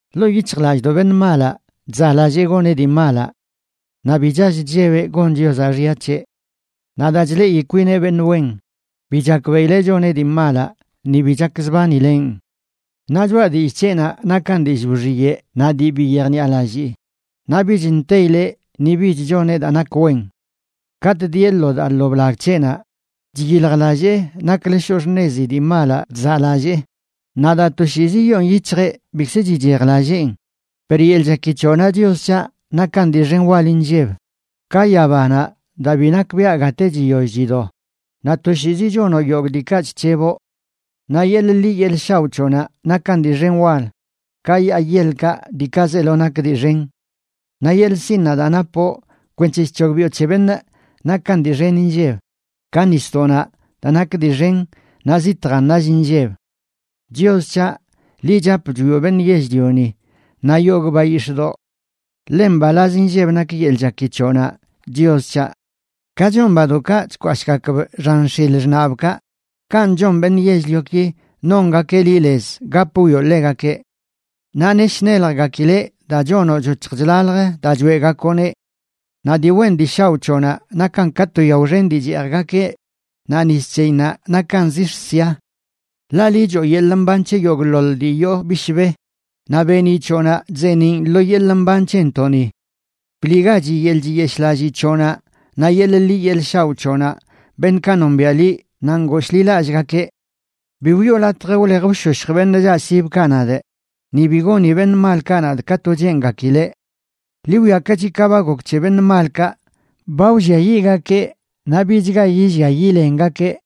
Ḻoo yic̱hjlallꞌdoꞌ beṉꞌ malaꞌ chzaꞌlallee goneꞌ dii malaꞌ. Naꞌ bi chall chllebeꞌ gon Chiozaꞌ xya c̱heꞌ. Naꞌ daa chleꞌi kwineꞌ beṉꞌ wen, bi chakbeꞌileꞌ choneꞌ dii malaꞌ ni bi chakzbanileꞌn. Naꞌ choꞌa dillꞌ c̱heꞌnaꞌ nakan dillꞌ wxiyeꞌ naꞌ dii bi yejniꞌalallii, naꞌ bich nteyileꞌ ni bich choneꞌ daa nak wen. Katꞌ dieꞌ lo daa lo blag c̱heꞌnaꞌ chyiljlallee naklə shoꞌ xṉezi dii malaꞌ chzaꞌlallee; naꞌ daa toshiizi yoon yic̱hjeꞌ, bikzə chichejlalleen. Per yeḻꞌ chaki c̱hoꞌnaꞌ, Chios c̱haꞌ, nakan dii xen wal inlleb ka yabanaꞌ daa bi nakbiaꞌ gate chiyoll chido; naꞌ toshiizi chonoꞌ yogꞌ diikaꞌ chc̱heboꞌ. Naꞌ yeḻꞌ ḻi yeḻꞌ shaoꞌ c̱hoꞌnaꞌ nakan dii xen wal ka yaa yeḻkaꞌ diikaꞌ zeelo nak dii xen. Naꞌ yeḻꞌ sinnaꞌ daa napoꞌ kwenc̱he chc̱hogbiꞌo c̱he beṉꞌ nakan dii xen inlleb, ka nisdoꞌnaꞌ daa nak dii xen naꞌ zitjan nall inlleb. Chios c̱haꞌ, liꞌ chap chwioꞌ beṉꞌ yell-lioni naꞌ yogꞌ bayix̱ꞌdoꞌ. ¡Ḻe mbalaz inlleb nak yeḻꞌ chaki c̱hoꞌnaꞌ, Chios c̱haꞌ! Ka chon badoꞌkaꞌ chkwashꞌgakb xan x̱il xṉaꞌbkaꞌ, kanꞌ chon beṉꞌ yell-lioki nongakeꞌ liꞌ lez gap wwioꞌ ḻegakeꞌ. Naꞌ nesh neljgakileꞌ daa chonoꞌ choc̱hj chlalj daa choeꞌgakoꞌneꞌ. Naꞌ dii wen dii shaoꞌ c̱hoꞌnaꞌ nakan ka to yao xen dii cheejgakeꞌ naꞌ nis c̱heyinnaꞌ nakan zix̱ sia. Ḻaꞌ liꞌ choo yeḻꞌ mban c̱he yogꞌḻoḻ dii yoo bishbe, naꞌ beeniꞌ c̱hoꞌnaꞌ chzeeniꞌn lo yeḻꞌ mban c̱hentoꞌni. Bliꞌgachi yeḻꞌ chiyeshꞌlallii c̱hoꞌnaꞌ naꞌ yeḻꞌ ḻi yeḻꞌ shaoꞌ c̱hoꞌnaꞌ beṉꞌkaꞌ nombiaꞌ liꞌ naꞌ ngooshḻilallꞌgakeꞌ. Bi wiꞌo latj wlej wshoshj beṉꞌ chaꞌsibkaꞌ nadꞌ, ni bi goni beṉꞌ malkaꞌ nadꞌ ka to cheengakileꞌ. Ḻi wwiakachi ka ba gok c̱he beṉꞌ malkaꞌ, ba wlliayiꞌgakeꞌ naꞌ bichga yillia yilengakeꞌ.